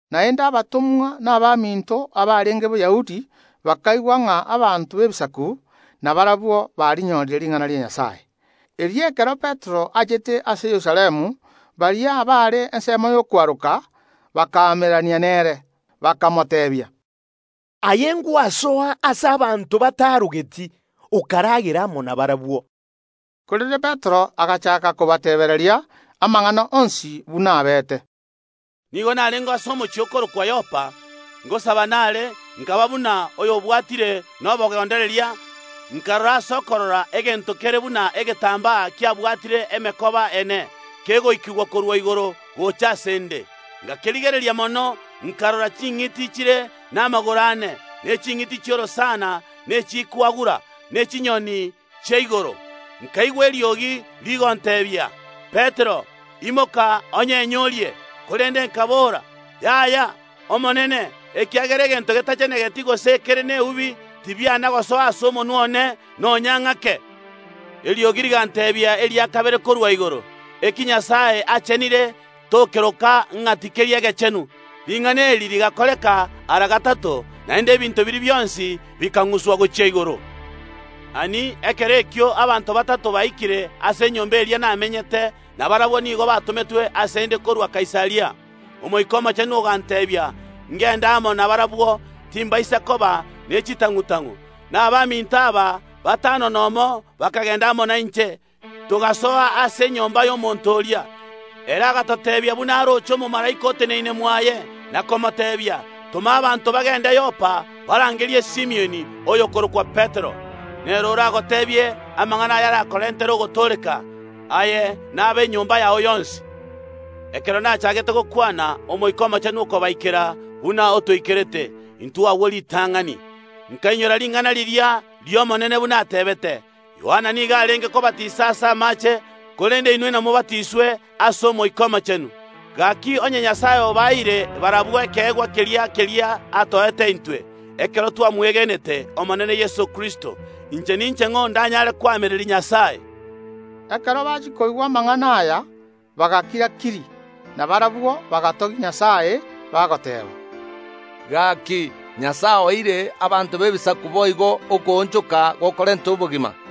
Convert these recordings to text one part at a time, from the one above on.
Naende abatomwa na abaminto abarenge Boyahudi bakaigwa ng’a abanto b’Ebisaku nabarabwo banyorire ring’ana ria Nyasae. Erio ekero Petero achete ase Yerusalemu, baria abare ensemo y’okwaroka bakaamererania nere, bakamoteebia: “Aye ngwasoa ase abanto batarogeti, okaragera amo nabarabwo!” Korende Petero agachaaka kobateebia amang’ana onsi buna abeete, “Nigo narenge ase omochie okorokwa Yopa, ngosaba nare, nkaba buna oyobwatire nobogondereria, nkarora ase okorora egento kere buna egetambaa kiabwatire emekoba ene, kegoikigwa korwa igoro gocha ase ’nde. Ngakerigereria mono, nkarora ching’iti chire n’amagoro ane, ne ching’iti chi’orosana, amo n’echikwagura, n’chinyoni chia igoro. Nkaigwa eriogi rigonteebia: Petero, imoka, onyenye orie! Korende nkabora: Yay’Omonene, ekiagera egento getachenegeti gose ekere neubi, tibiana gosoa ase omonwa one nonya ng’ake. Eriogi riganteebia eria kabere korwa igoro: Eki Nyasae achenire tokeroka ng’a tikeri egechenu. Ring’ana eri rigakoreka ara gatato, naende ebinto biria bionsi bikang’uswa gochia igoro. Ani! Ekero ekio abanto batato baikire ase enyomba eria namenyete, na barabwo nigo batometwe ase ’nde korwa Kaisaria. Omoika Omochenu oganteebia ngende amo nabarabwo, timbaisa koba ne chitang’u‐tang’u. Na abaminto aba batano nomo bakagenda amo nainche, togasoa ase enyomba y’omonto oria; ere agatoteebia buna aroche omomalaika oteneine mwaye, na komoteebia: Toma abanto bagende Yopa, barangerie Simioni, oyokorokwa Petero. Nere oragoteebie amang’ana ayarakorentere ogotooreka, aye na ab’enyomba yao yonsi. Ekero nachaagete gokwana, Omoika Omochenu okabaikera buna otoikerete intwe agwo ritang’ani. Nkainyora ring’ana riria ri’Omonene, buna ateebete: Yohana nigo arenge kobatisa ase amaache, korende inwe inamobatiswe ase Omoika Omochenu. Gaki, onye Nyasae obaeire barabwo ekeegwa keria keria atoete intwe, ekero twamwegenete Omenene oito Yeso Kristo, inche ninche ng’o, ndanyaare koamereria Nyasae?” Ekero bachia koigwa amang’ana aya, bagakira‐kiri. Na barabwo bagatogia Nyasae, bagoteeba: “Gaki, Nyasae oeire abanto b’Ebisaku boigo okoonchoka okwo gokorenta obogima.”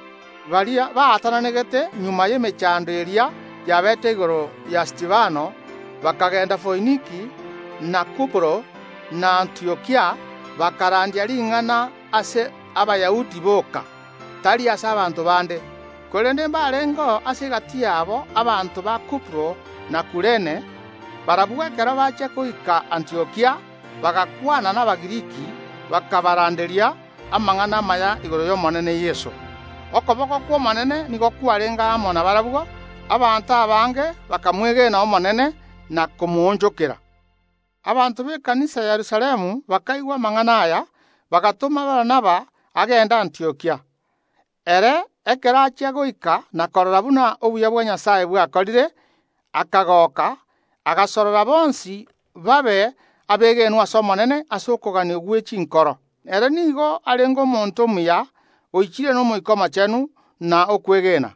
Baria baatananegete magega y’emechando eria yabeete igoro ya Stefano bakagenda Foiniki na Kuporo, na Antiokia, bakarandia ring’ana ase Abayahudi boka, tari ase abanto bande. Korende mbarengeo ase egati yabo abanto ba Kuporo na Kurene, barabwo ekero bachia goika Antiokia bagakwana n’Abagiriki, bakabaranderia amang’ana amaya igoro y’Omonene Yeso. Okoboko kw’Omonene nigo kwarenge amo nabarabwo; abanto abange bakamwege n’Omonene, na komoonchokera. Abanto b’ekanisa ya Yerusalemu bakaigwa amang’ana aya, bagatoma Barnaba agende Antiokia. Ere, ekero achia goika na korora buna obuya bwa Nyasae bwakorire, akagoka, agasorora bonsi babe abegenwa ase Omonene ase okogania gwe chinkoro. Ere nigo arenge omonto omuya, oichire n’Omoika Omochenu na okwegena.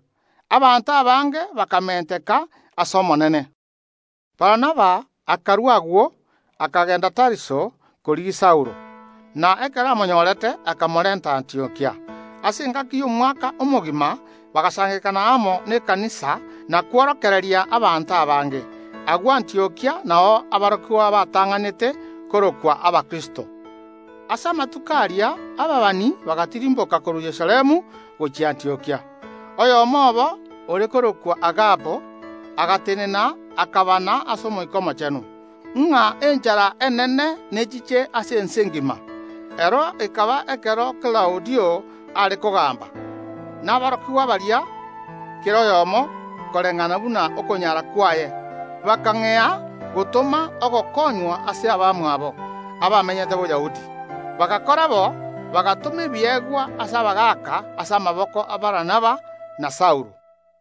Abanto abange bakamenteka ase Omonene. Barnaba akarua agwo, akagenda Tariso korigia Saulo, na ekero amonyorete akamorenta Antiokia. Ase engaki y’omwaka omogima bagasangererekana amo ase ekanisa na kworokereria abanto abange. Agwo Antiokia nao aborokigwa batang’anete korokwa Abakristo. Ase amatuko aria ababani bagatirimboka korwa Yerusalemu gochia Antiokia. Oyomo obo, ore korokwa Agabo, agatenena akabana ase Omoika Omochenu, ng’a enchara enene nechiche ase ense engima; ero ekaba ekero Klaudio are kogamba. Na aborokigwa baria, kera oyomo koreng’ana buna okonyara kwaye, bakang’ea gotoma ogokonywa ase abamwabo abamenyete Boyahudi. Bagakora bo, bagatoma ebiegwa ase abagaaka ase amaboko a Barnaba na Saulo.